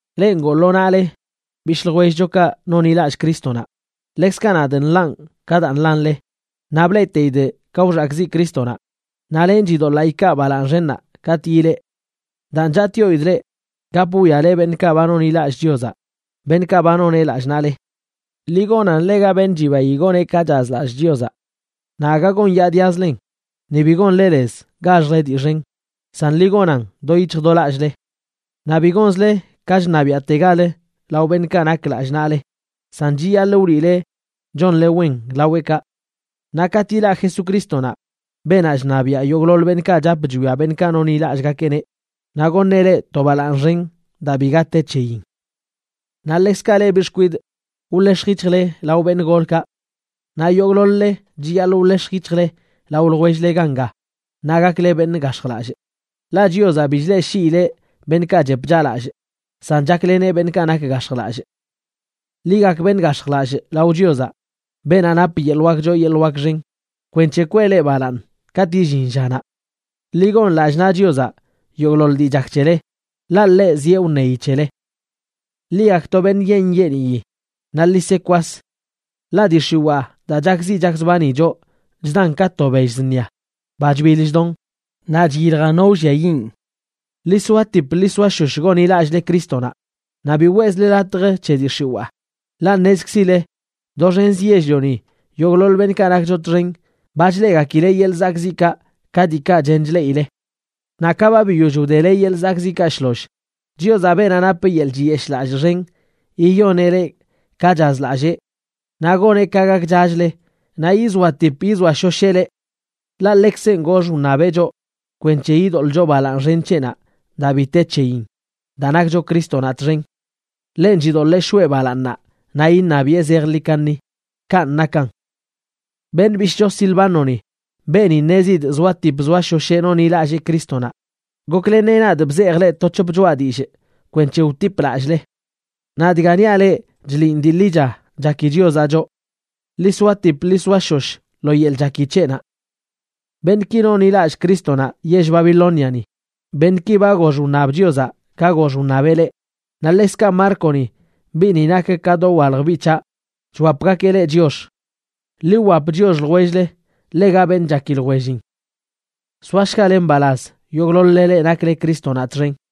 Leꞌ ngoo lo naꞌle bishꞌ ljwellchokaꞌ nonḻilallꞌ Crístonaꞌ, ḻekzkaꞌ nadꞌ nḻanꞌ ka daa nḻanle, naꞌ bleꞌteidꞌ ka wxakꞌziꞌ Crístonaꞌ, naꞌ lenꞌ chidoḻaa ikaa balaaṉ xennaꞌ katꞌ yilee. Daan, chatꞌyoidꞌ leꞌ: Gap wwiale beṉꞌkaꞌ ba nonḻilallꞌ Chiozaꞌ, beṉꞌkaꞌ ba noneꞌ lallꞌ naꞌle. Ḻi gonan ḻega beṉꞌ chibayi gon ka chazlallꞌ Chiozaꞌ. Naꞌ aga gonyaadiazlen, ni bi gonle lez gaxjle dii xen, san ḻi gonan do yic̱hj do lallꞌle. Naꞌ bi gonzle ka chṉabiaꞌtegal lao beṉꞌkaꞌ nak lallꞌ naꞌle, san chiyaḻꞌ wliꞌle chonle wen laweꞌkaꞌ. Naꞌ katꞌ yilaꞌ Jesucrístonaꞌ, beenaꞌ chṉabiaꞌ yogꞌḻoḻ beṉꞌkaꞌ chap chwia beṉꞌkaꞌ nonḻilallꞌgakeꞌneꞌ, naꞌ goṉeꞌ leꞌ to balaaṉ xen daa biga te c̱heyin. Naꞌ ḻekzkaꞌ leꞌ biꞌ xkwidꞌ, wḻex̱j yic̱hjle lao beṉꞌ golkaꞌ. Naꞌ yogꞌḻoḻ-le chiyaḻꞌ wḻex̱j yic̱hjle lao ljwell-le ganga, naꞌ gakle beṉꞌ gax̱jlallꞌ, ḻaꞌ: Chiozaꞌ bi chleꞌshiileꞌ beṉꞌkaꞌ chep chaꞌlallꞌ, san chakleneꞌ beṉꞌkaꞌ nak gax̱jlallꞌ. Ḻi gak beṉꞌ gax̱jlallꞌ lao Chiozaꞌ, beenaꞌ nap yeḻꞌ wak choo yeḻꞌ wak xen, kwenc̱he kwee leꞌ balaaṉ katꞌ illin llanaꞌ. Ḻi gon lallꞌ naꞌ Chiozaꞌ yogꞌḻoḻ dii chak c̱hele, ḻaꞌ ḻeꞌ zieꞌ wṉeyi c̱hele. Ḻi gakto beṉꞌ nyeeṉ nyeeniyi naꞌ ḻi se kwas. Ḻaꞌ dii x̱iwaa daa chakziꞌ chakzbani choꞌ chdan ka to bell zṉia, ba chbiḻ chdon, naꞌ chyiljan no wlliayiꞌn. Ḻi soatip ḻi soashosh gonḻilallꞌle Crístonaꞌ naꞌ bi weꞌzle latj c̱he dii x̱iwaa, ḻaꞌ ṉezkzileꞌ doxenzə yell-lioni yogꞌḻoḻ beṉꞌkaꞌ nakcho txen ba chleꞌgakileꞌ yeḻꞌ zakꞌziꞌkaꞌ ka diikaꞌ chen chleꞌile. Naꞌ ka ba biyoll wdele yeḻꞌ zakꞌziꞌkaꞌ shloll, Chiozaꞌ, beenaꞌ nap yeḻꞌ chiyeshꞌlallꞌ xen, yiyoneꞌ leꞌ ka chazlallee naꞌ goneꞌ ka gakchachle naꞌ yizoatip yizoashosheꞌ leꞌ. Ḻaꞌ ḻekzenꞌ gox wṉabeꞌ choꞌ kwenc̱he yidoḻꞌcho balaaṉ xen c̱heꞌnaꞌ daa bi te c̱heyin daa nakcho Crístonaꞌ txen. Ḻenꞌ chidoḻee shoꞌe balaaṉnaꞌ naꞌ iṉabiꞌe zejḻi kaṉi. Kanꞌ nakan. Beṉꞌ bishꞌcho Silvánoni, beeni ṉezidꞌ zoatip zoashosheꞌ nonḻilallee Crístonaꞌ, gokleneꞌ nadꞌ bzejꞌ leꞌ to c̱hop choꞌa dillꞌ kwenc̱he wtipꞌ lallꞌle. Naꞌ dga niaꞌ leꞌ chliꞌn dii ḻicha chaki Chiozaꞌ choꞌ. Ḻi soatip ḻi soashosh lo yeḻꞌ chaki c̱heꞌnaꞌ. Beṉꞌki nonḻilallꞌ Crístonaꞌ yell Babilóniani, beṉꞌki ba gox wṉab Chiozaꞌ ka gox wṉabeꞌ leꞌ, naꞌ ḻekzkaꞌ Márconi, biꞌni nak ka dowalj biꞌ c̱haꞌ, chwapgakeꞌ leꞌ chiox. Ḻi wwap chiox ljwell-le ḻega beṉꞌ chaki ljwellin. Soashgale mbalaz yogꞌḻoḻ-le leꞌ nakle Crístonaꞌ txen.